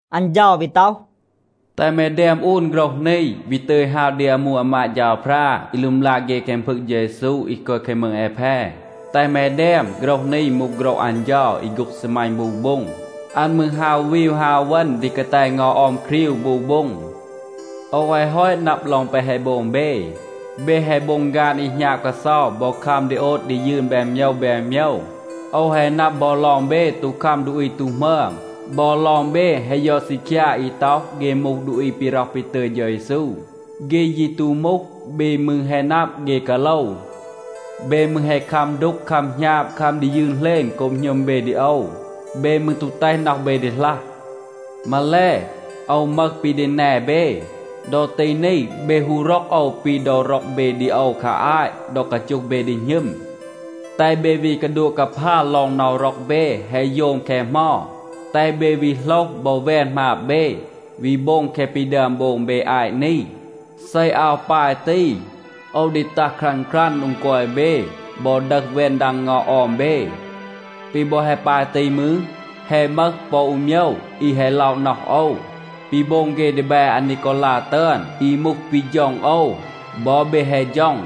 อัน เฌา วี ต็อห, “แตห แม แดม อูน โฆรห นี, วี ตึย ฮาว ดี อามู อามาด เฌาพรา อี ลึมลา เฆ แคง พึง เฌา เยซู อี กอย แคง มืง แอแพ. แตห แม แดม, ‘โฆรห นี มูห โฆรห อัน เฌา อี โฆ็ง ซีมัณ บู โบ็ง. อัน มืร ฮาว วีว ฮาว เวณ ดี กาแต เงา ออม ครีว บู โบ็ง. โอว แฮะ ฮอต นับ ลอง แปะ แฮะ โบง เบ. เบ แฮะ โบง ฆาน อี หณาบ กาเซา บอ คัม ดี โอด ดี ยืน แบน โมยว แบน โมยว. โอว แฮะ นับ บอ ลอง เบ ตู คัม ดูอี ตู หมึอม, บอ ลอง เบ แฮะ ยอด ซีคยา อี ต็อห เฆ มูห ดูอี ปี ร็อห ปี ตึย เฌา เยซู. เฆ ยี ตู มูห. เบ มืร แฮะ นับ, เฆ กาโลว. เบ มืร แฮะ คัม ดูก คัม หณาบ, คัม ดี ยืน เหลณ โกบ หณึม เบ ดี โอว. เบ มืร ตู แตห น็อห เบ ดีหลัห. มาแล, โอว มึห ปี ดี แน เบ. ดอ ตี นี, เบ ฮู ร็อก โอว ปี ดอ ร็อก เบ ดี โอว คา อาต ดอ กาจูห เบ ดี หณึม. แตห เบ วี กาดัวะ กาพา ลอง น็อห ร็อก เบ แฮะ โยม แคะ เหมา. แตห เบ วี โหลห บอ แวน หมาบ เบ, วี โบง แคะ ปี ดึอม โบง เบ อาต นี. เซ อาว ปาย ตี, โอว ดี ตัห ครัน ครัน โดง กอย เบ บอ ดึห แวน ดัง เงา ออม เบ. ปี บอ แฮะ ปาย ตี มืร, แฮะ มึห ปอ อู โมยว อี แฮะ ล็อะ น็อห โอว. ปี โบง เฆ ดีแบ อานีกอลา ตึอน อี มูห ปี ฌ็อง โอว, บอ เบ แฮะ ฌ็อง.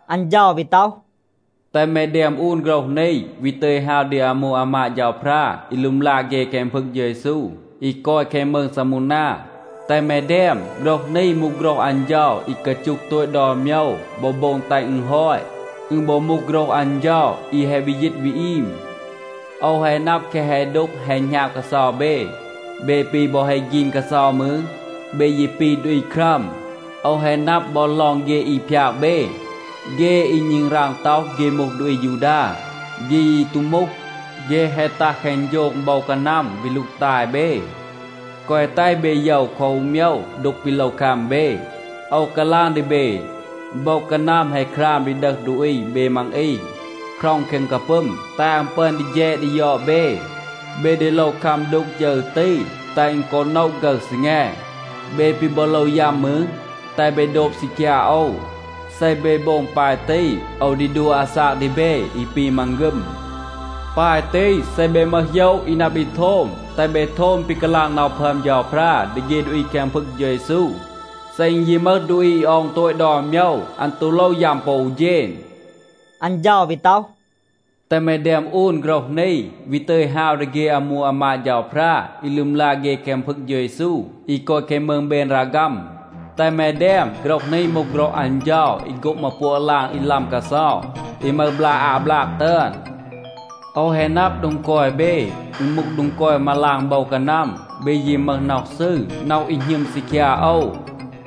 อัน เฌา วี ต็อห, “แตห แม แดม อูน โฆรห นี, วี ตึย ฮาว ดี อามู อามาด เฌาพรา อี ลึมลา เฆ แคง พึง เฌา เยซู อี กอย แคง มืง ซามูนา. แตห แม แดม, ‘โฆรห นี มูห โฆรห อัน เฌา อี กาจูห โตต ดอน โมยว บอ โบง แตห อึณ ฮอต. อึณ บอ มูห โฆรห อัน เฌา อี แฮะ วี ยีต วี อีม. โอว แฮะ นับ แคะ แฮะ ดูก แฮะ หณาบ กาเซา เบ. เบ ปี บอ แฮะ ฆีน กาเซา มืร, เบ ยี ปี ดูอี ครัม. โอว แฮะ นับ บอ ลอง เฆ อี พยาก เบ, เฆ อี ณึงราง ต็อห เฆ มูห ดูอี อายูดา, เฆ ยี ตู มูห. เฆ แฮะ ตัห แคง โฌง โบว กานัม วี ลูกตาย เบ. แกวะ แตห เบ โยว คอ อู โมยว ดูก ปี โลว คัม เบ. โอว กาลาง ดี เบ, โบว กานัม แฮะ คราม ดี ดึห ดูอี เบ มัง อี, คร็อง แคง กาปึม, แตห อัน ปึอน ดี แฌด ดี ยอด เบ. เบ ดี โลว คัม ดูก ฌึร ตี, แตห อึณ กอ โนะ ฆึร ซีแง. เบ ปี บอ โลว ยัม มืร, แตห เบ โดบ ซีคยา โอว. เซ เบ โบง ปาย ตี, โอว ดี ดัว อาซาก ดี เบ อี ปี มังฆึม. ปาย ตี, เซ เบ มึห โหยะ อี นับ ดี โทม, แตห เบ โทม ปี กาลาง น็อห พึอม เฌาพรา ดี เฆ ดูอี แคง พึง เฌา เยซู. เซ อึณ ยี มึห ดูอี อี ออง โตต ดอน โมยว, อัน ตู โลว ยัม ปอ อู เฌณ.’” อัน เฌา วี ต็อห, “แตห แม แดม อูน โฆรห นี, วี ตึย ฮาว ดี เฆ อามู อามาด เฌาพรา อี ลึมลา เฆ แคง พึง เฌา เยซู อี กอย แคง มืง เบนราฆัม. แตห แม แดม, ‘โฆรห นี มูห โฆรห อัน เฌา อี โฆ็ง มาปัวะ ลาง อี ลัม กาเซา อี มึห บลา อา บลาก ตึอน. โอว แฮะ นับ โดง กอย เบ, อึณ มูห โดง กอย มาลาง โบว กานัม. เบ ยี มึห น็อห ซืร, น็อห อี หณึม ซีคยา โอว.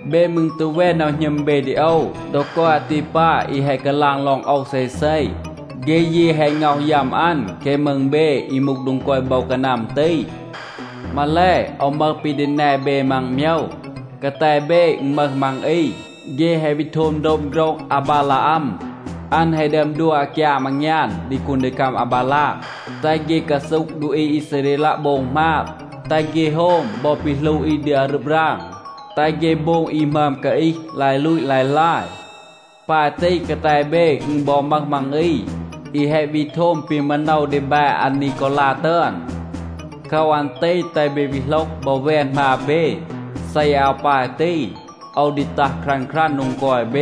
เบ มืร ตู แวน น็อห หณึม เบ ดี โอว ดอ กอย อาตีปา อี แฮะ กาลาง ลอง โอว เซเซ. เฆ ยี แฮะ ง็อห ยัม อัน แคง มืง เบ อี มูห โดง กอย โบว กานัม ตี. มาแล, โอว มึห ปี ดี แน เบ มัง โมยว. กาแต เบ อึณ มึห มัง อี, เฆ แฮะ วี โทม โดบ โฆรห อาบาลาอัม. อัน แฮะ ดึอม ดัว อากยาม อางยาน ดี คูนดีคัม อาบาลาก, แตห เฆ กาซูห ดูอี อีซาเรลัะ โบง หมาบ, แตห เฆ โฮม บอ ปี หลู อี ดี อารึบ ราง, แตห เฆ โบง อี หมึอม กาอีห, ลาย ลูต ลาย ลาย. ปาย ตี, กาแต เบ อึณ บอ มึห มัง อี อี แฮะ วี โทม ปี มาโนว ดีแบ อานีกอลา ตึอน. โคว อัน ตี แตห เบ วี โหลห บอ แวน หมาบ เบ. เซ อาว ปาย ตี, โอว ดี ตัห ครัน ครัน โดง กอย เบ.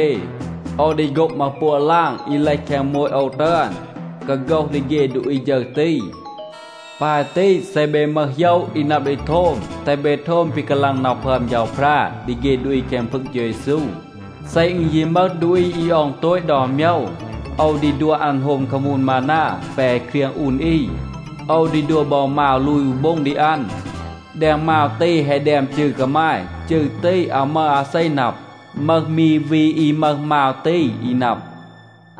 โอว ดี โฆ็ง มาปัวะ ลาง อี เลห แคง โมต โอว ตึอน, กาโฆห ดี เฆ ดูอี ฌึร ตี. ปาย ตี, เซ เบ มึห โหยะ อี นับ ดี โทม, แตห เบ โทม ปี กาลาง น็อห พึอม เฌาพรา ดี เฆ ดูอี แคง พึง เฌา เยซู. เซ อึณ ยี มึห ดูอี อี ออง โตต ดอน โมยว, โอว ดี ดัว อัน โฮม คามูน มานา แปะ แฮะ เครียง อูน อี. โอว ดี ดัว บอ มาว ลูย อู โบ็ง ดี อัน. แดง มาว ตี, แฮะ แดม จืร กามาย. จืร ตี, อาว มึห อาเซ นับ. มึห มี วี อี มึห มาว ตี อี นับ.’”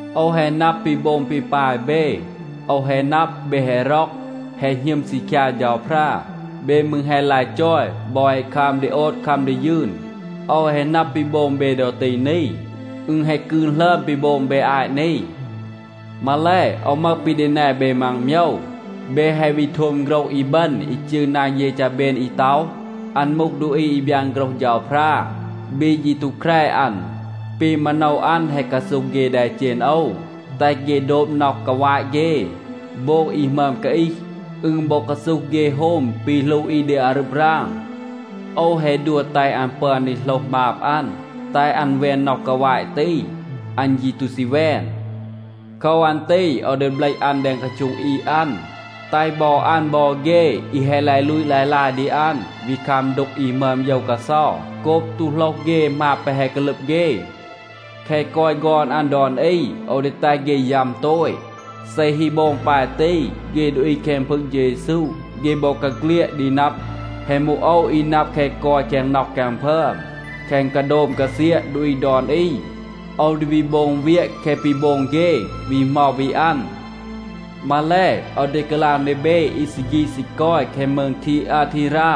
โอว แฮะ นับ ปี โบง ปี ปาย เบ. โอว แฮะ นับ, เบ แฮะ ร็อก, แฮะ หณึม ซีคยา เฌาพรา. เบ มืร แฮะ ลาย จอย บอ แฮะ คัม ดี โอด, คัม ดี ยืน. โอว แฮะ นับ ปี โบง เบ ดอ ตี นี, อึณ แฮะ กืน หลึอม ปี โบง เบ อาต นี. มาแล, โอว มึห ปี ดี แน เบ มัง โมยว. เบ แฮะ วี โทม โฆรห อีบึณ อี จืร นาง เยจาเบน อี ต็อห, อัน มูห ดูอี อี บยาน โฆรห เฌาพรา. เบ ยี ตู แคร อัน. ปี มาโนว อัน แฮะ กาซูห เฆ แดเจณ โอว, แตห เฆ โดบ น็อห กาวาต เฆ, โบง อี หมึอม กาอีห. อึณ บอ กาซูห เฆ โฮม ปี หลู อี ดี อารึบ ราง. โอว แฮะ ดัว แตห อัน ปึอน ดี โหลห หมาบ อัน, แตห อัน แวน น็อห กาวาต ตี. อัน ยี ตู ซี แวน. โคว อัน ตี โอว ดี เบลห อัน แดง กาโช็ง อีด อัน, แตห บอ อัน บอ เฆ อี แฮะ ลาย ลูต ลาย ลาย ดี อัน วี คัม ดูก อี หมึอม โยว กาเซา โกบ ตู โหลห เฆ หมาบ แปะ แฮะ กาลึบ เฆ. แคะ กอย ฆอน อัน ดอน อี, โอว ดี แตห เฆ ยัม โตต. เซ ฮี โบง ปาย ตี, เฆ ดูอี แคง พึง เฌา เยซู, เฆ บอกาเฆลียด ดี นับ, แฮะ มูห โอว อี นับ แคะ กอย แคง น็อห แคง พึอม, แคง กาโดม กาเซียะ ดูอี ดอน อี. โอว ดี วี โบง เวียะ แคะ ปี โบง เฆ วี เหมา วี อัน. มาแล, โอว ดี กาลาง ดี เบ อี ซี ฆีด ซี กอย แคง มืง ทีอาทีรา,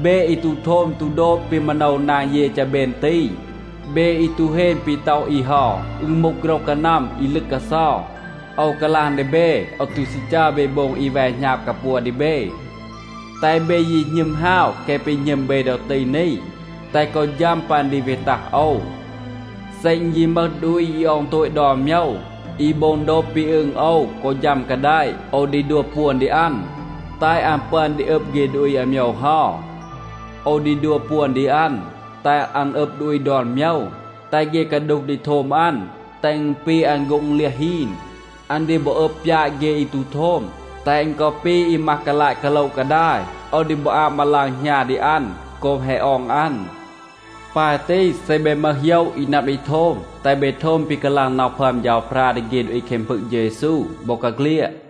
เบ อี ตู โทม ตู โดบ ปี มาโนว นาง เยจาเบน ตี, เบ อี ตู เฮน ปี ต็อห อี เฮา, อึณ มูห โฆรห กานัม อี ลึก กาเซา. โอว กาลาง ดี เบ, โอว ตู ซี จัร เบ โบง อี แว หณาบ กาปัว ดี เบ. แตห เบ ยี หณึม ฮาว แคะ ปี หณึม เบ ดอ ตี นี, แตห กอ ฌัม ปัน ดี วี ตัห โอว. เซ อึณ ยี มึห ดูอี อี ออง โตต ดอน โมยว, อี โบง โดบ ปี อึง โอว กอ ฌัม กาแดะ, โอว ดี ดัว ปวน ดี อัน, แตห อัน ปึอน ดี อึบ เฆ ดูอี อาโมยว เฮา. โอว ดี ดัว ปวน ดี อัน, แตห อัน อึบ ดูอี ดอน โมยว. แตห เฆ กาดูห ดี โทม อัน, แตห อึณ ปี อัน โฆ็ง เลียห ฮีน. อัน ดี บอ อึบ ปยาต เฆ อี ตู โทม, แตห อึณ กอ ปี อี มัห กาลาต กาโละ กาดาย. โอว ดี บอ อาบ มาลาง หณา ดี อัน โกบ แฮะ ออง อัน. ปาย ตี, เซ เบ มึห โหยะ อี นับ ดี โทม, แตห เบ โทม ปี กาลาง น็อห พึอม เฌาพรา ดี เฆ ดูอี แคง พึง เฌา เยซู บอกาเฆลียด.’”